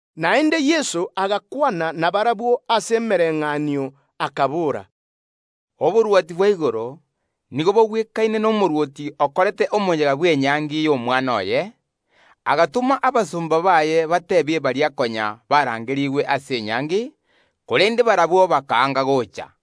Naende Yeso agakwana nabarabwo ase emebayeeno akabora, “Oborwoti bwa igoro nigo bogwekaine nomorwoti okorete omoyega bw’enyangi y’omwana oye. Agatoma abasomba baye batuunye baria konya barangerigwe ase enyangi, korende barabwo bakaanga gocha.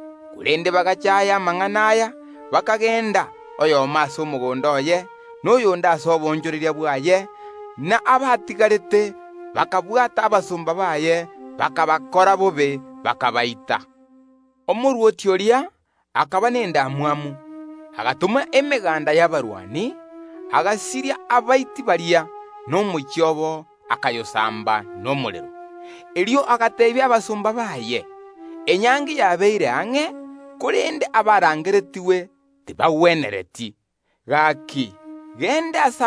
Korende bagachaaya amang’ana aya, bakagenda, oyomo ase omogondo oye, na oyonde ase oboonchoreria bwaye; na abatigarete bakabwata abasomba baye, bakabakorera bobe bakabaita. Omorwoti oria akaba nendamwamu, agatoma emeganda y’abarwani, egasiria abaiti baria, na koyosamba omochie obo nomorero. Erio agateebia abasomba baye: Ekeene enyangi yabeire ang’e, korende abaariganetigwe tibagwenereti. Gaki, genda ase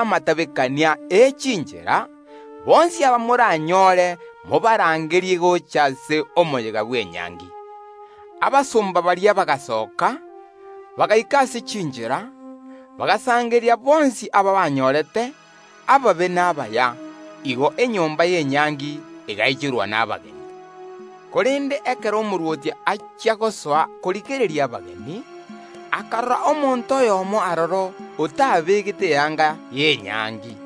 chinchera chinene, aba moranyore bonsi mobarangerie gocha ase omoyega bw’enyangi. Abasomba baria bagasoka, bagaika ase chinchera, bagasangereria abanyorete bonsi, ababe na abaya; igo enyomba y’enyangi egaichorwa nabageni. “Korende ekero omorwoti achia gosoa korigereria abageni, akarora omonto oyomo aroro otabegete eyanga y’enyangi.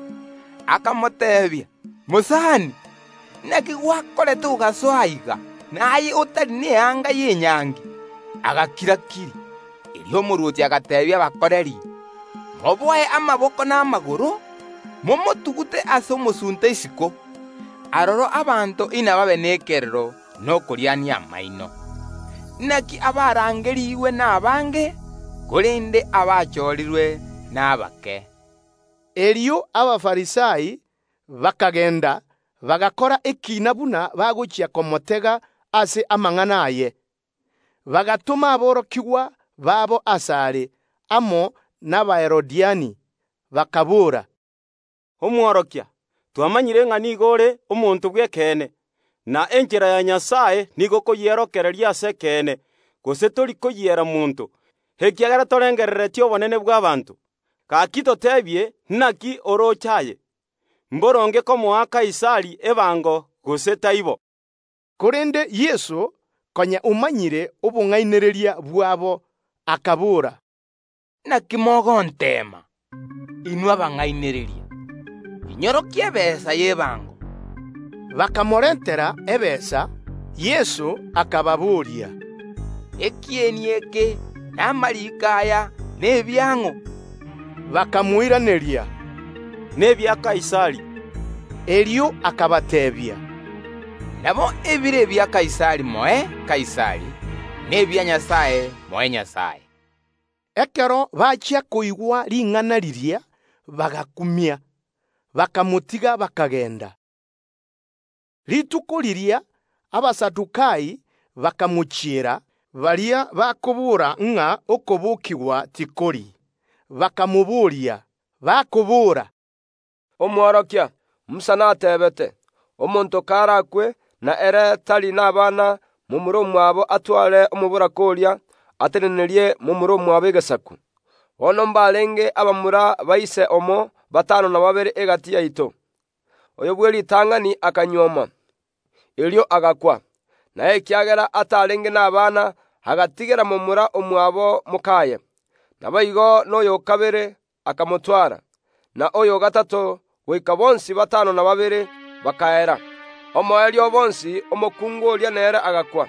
Akamoboria: Mosani, naki gwakorete ogasoa aiga, na aye otari neyanga y’enyangi? Agakira‐kiri. Erio omorwoti agateebia abakoreri: Moboe amaboko na amagoro, momotugute ase omosunte isiko; aroro abanto inababe nekerero na okoriania amaino. Inaki abarangerigwe nabaange, korende abachorirwe nabake.” Erio Abafarisai bakagenda, bakaroberia buna bagochia gotega Yeso ase amang’ana aye. Bagatoma aborokigwa babo ase are, amo n’Abaherode, bakaboora, “Omworokia, twamanyire ng’a nigo ore omonto bw’ekeene, na enchera ya Nyasae nigo okoyiorokereria ase ekeene, gose tori koyiera monto; ekiagera torengerereti obonene bw’ abanto. Gaki toteebie naki orooche aye? Mboronge komoa Kaisari ebango, gose taibo.” Korende Yeso, konya omanyire obong’ainereria bwabo, akabora, “Inaki mogonteema, inwe abang’ainereria? Inyorokie ebesa y’ebango.” Bakamorentera ebesa. Yeso akababoria, “Ekieni eke na amariiko aya nebiang’o?” Bakamoiraneria, “Nebia Kaisari.” Erio akabateebia, “Nabo, ebire ebia Kaisari moe Kaisari, na ebia Nyasae moe Nyasae.” Ekero bachia koigwa ring’ana riria, bagakumia; bakamotiga, bakagenda. Rituko erio erio Abasadukai bakamochiera, baria bagoteeba ng’a okobokigwa tikoiyo, bakamobooria, bakobora, “Omworokia, Musa nateebete: Omonto karakwe, na ere tari n’abana, momura omwabo atware omoboraka oria, atenenerie momura omwabo egesaku. Bono mbarenge abamura ba ise oyomo batano na babere egati yaito. Oyo bw’eritang’ani akanyuoma, erio agakwa, na ekiagera atarenge nabana, agatigera momura omwabo mok’aye. Naboigo noyo o kabere akamotwara, na oyo o gatato, goika bonsi batano na babere bakaera. Omoerio o bonsi omokungu oria nere agakwa.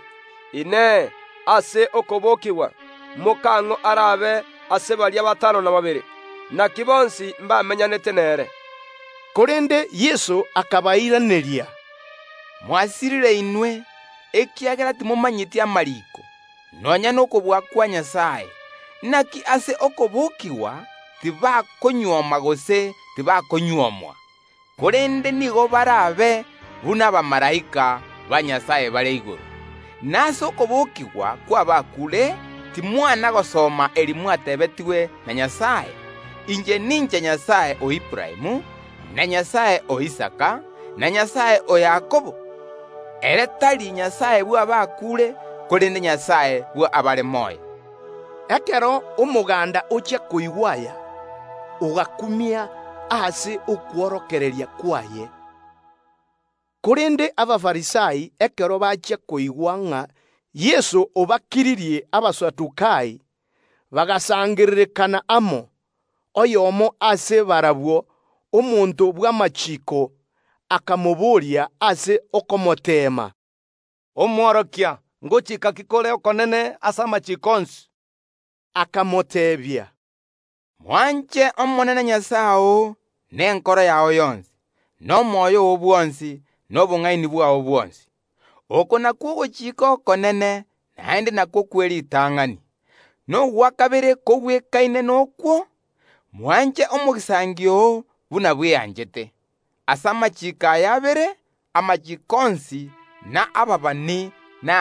Inee! Ase okobokigwa, mokang’o arabe ase baria batano na babere; naki bonsi mbameny’anete nere?” Korende Yeso akabairaneria, “Mwasirire inwe, ekiagera timomanyeti amariiko, nonya nokobua kwa Nyasae. Inaki ase okobokigwa tibakonyuoma gose tibakonyuomwa, korende nigo barabe buna abamalaika ba Nyasae bare igoro. Na ase okobokigwa kw’abakuure timwana gosoma eri mwatebetigwe na Nyasae: Inche ninche Nyasae o Aburaamu, na Nyasae o Isaka, na Nyasae o Yakobo? Ere tari Nyasae bw’abakuure, korende Nyasae bw’abare moyo.” Ekero omoganda ochia koigwa aya, ogakumia ase okworokereria kwaye. Korende Abafarisai, ekero bachia koigwa ng’a Yeso obakiririe Abasadukai, bagasangererekana amo. Oyomo ase barabwo, omonto bw’amachiiko, akamobooria ase okomoteema, “Omworokia, ngochiika ki kore okonene ase amachiiko onsi?” Akamoteebia, “Mwanche Omonene Nyasae oo nenkoro yao yonsi, na omoyo oo bwonsi, na obong’aini bwao bwonsi. Oko nakwo ogochika okonene, naende nakwo kw’eritang’ani. Nogwa kabere gokoreng’aine noko: Mwanche omogisangio oo buna bweanchete aye omonyene. Ase amachiiko aya abere naro atenenerete amachiiko onsi na ababani.”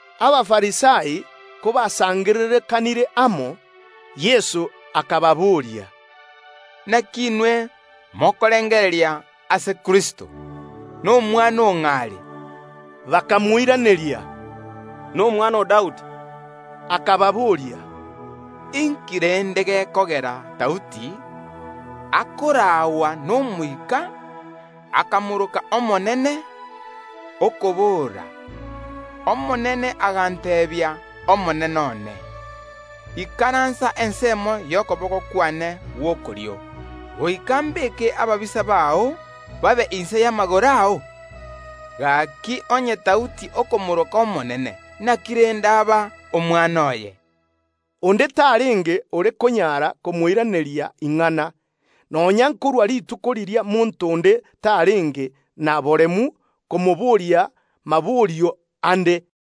Abafarisai kobasangererekanire amo, Yeso akababoria, “Inaki inwe mokorengereria ase Kristo? Nomwana o ng’o are?” Bakamoiraneria, “Nomwana o Daudi.” Akababoria, Inki rende gekogera Daudi, akoraagwa n’Omoika, akamoroka Omonene, okobora: Omonene agateebia Omonene one: Ikaransa ensemo y’okoboko kwane gw’okorio, goika ’mbeke ababisa bao babe inse y’amagoro ao? Gaki, onye Daudi okomooroka Kristo, naki rende arabe omwana oye? Onde tarenge ore konyara komoiraneria ing’ana; nonya nkorwa rituko riria monto onde tarenge na boremu komoboria maborio ande.